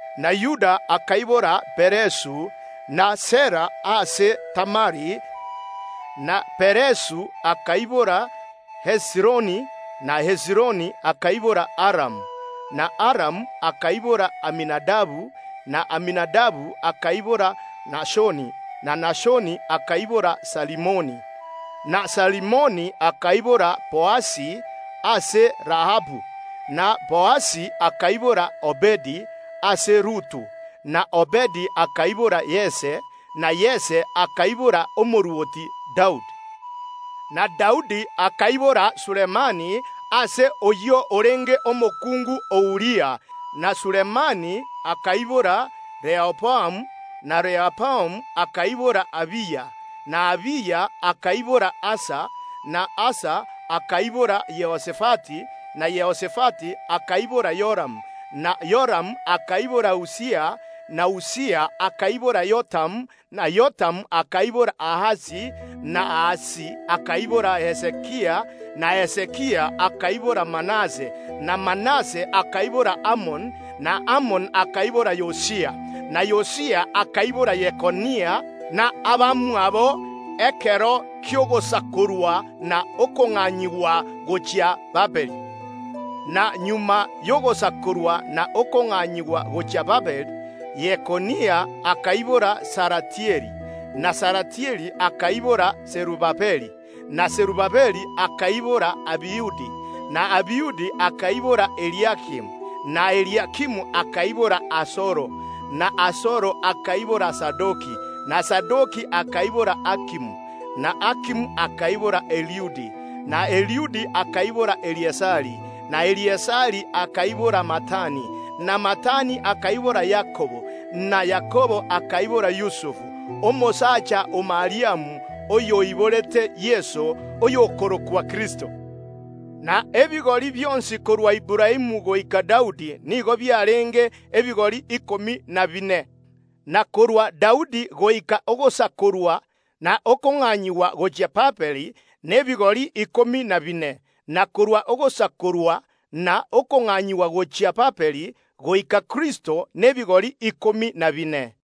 na Yuda akaibora Peresu na Zera ase Tamari, na Peresu akaibora Hezironi, na Hezironi akaibora Aramu, na Aramu akaibora Aminadabu, na Aminadabu akaibora Nashoni, na Nashoni akaibora Salimoni, na Salimoni akaibora Boazi ase Rahabu, na Boazi akaibora Obedi ase Rutu, na Obedi akaibora Yese, na Yese akaibora omorwoti Daudi. Na Daudi akaibora Sulemani ase oyio orenge omokungu o Uria, na Sulemani akaibora Rehoboamu, na Rehoboamu akaibora Abiya, na Abiya akaibora Asa, na Asa akaibora Yehosafati, na Yehosafati akaibora Yoramu, na Yoramu akaibora Usia, na Usia akaibora Yotamu na Yotamu akaibora Ahasi, na Ahasi akaibora Hezekia, na Hezekia akaibora Manase, na Manase akaibora Amoni, na Amoni akaibora Yosia, na Yosia akaibora Yekonia na abamwabo ase chingaki chiria Abaisraeli basakoretwe na kong’anyigwa gochia Babiloni. Na magega ko Abaisraeli basakoirwe na kong’anyigwa gochia Babiloni Yekonia akaibora Salatieli, na Salatieli akaibora Serubabeli, na Serubabeli akaibora Abihudi, na Abihudi akaibora Eliakimu, na Eliakimu akaibora Azoro, na Azoro akaibora Zadoki, na Zadoki akaibora Akimu, na Akimu akaibora Eliudi, na Eliudi akaibora Eleazari, na Eleazari akaibora Matani, na Matani akaibora Yakobo, na Yakobo akaibora Yusufu, omosacha o Mariamu oyo oiborete Yeso, oyio okorokwa Kristo. Na ebigori bionsi korwa Aburaamu goika Daudi nigo biarenge ebigori ikomi na bine: na korwa Daudi goika ogosakorwa na okong’anyigwa kwa Abaisraeli gochia Babiloni, n’ebigori ikomi na bine: na korwa ogosakorwa na okong’anyigwa kwa Abaisraeli gochia Babiloni goika Kristo, nebigori ikomi na bine.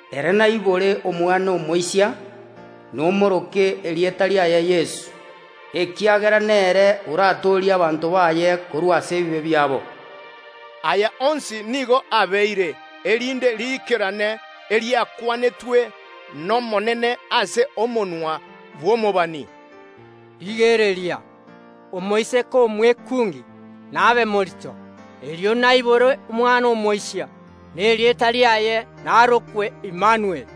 Ere naibore omwana omoisia, nomoroke erieta riaye Yeso, ekiagera nere oratoorie abanto baye korwa ase ebibe biabo.” Aya onsi nigo abeire, erinde riikerane ring’ana riria riakwanetwe n’Omonene goetera ase omonwa bw’omobani: “Rigereria, omoiseke omwekungi nabe morito, erio aibore omwana omoisia, na erieta riaye narokwe Imanueli”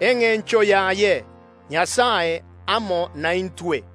(engencho yaye: Nyasae nare naintwe).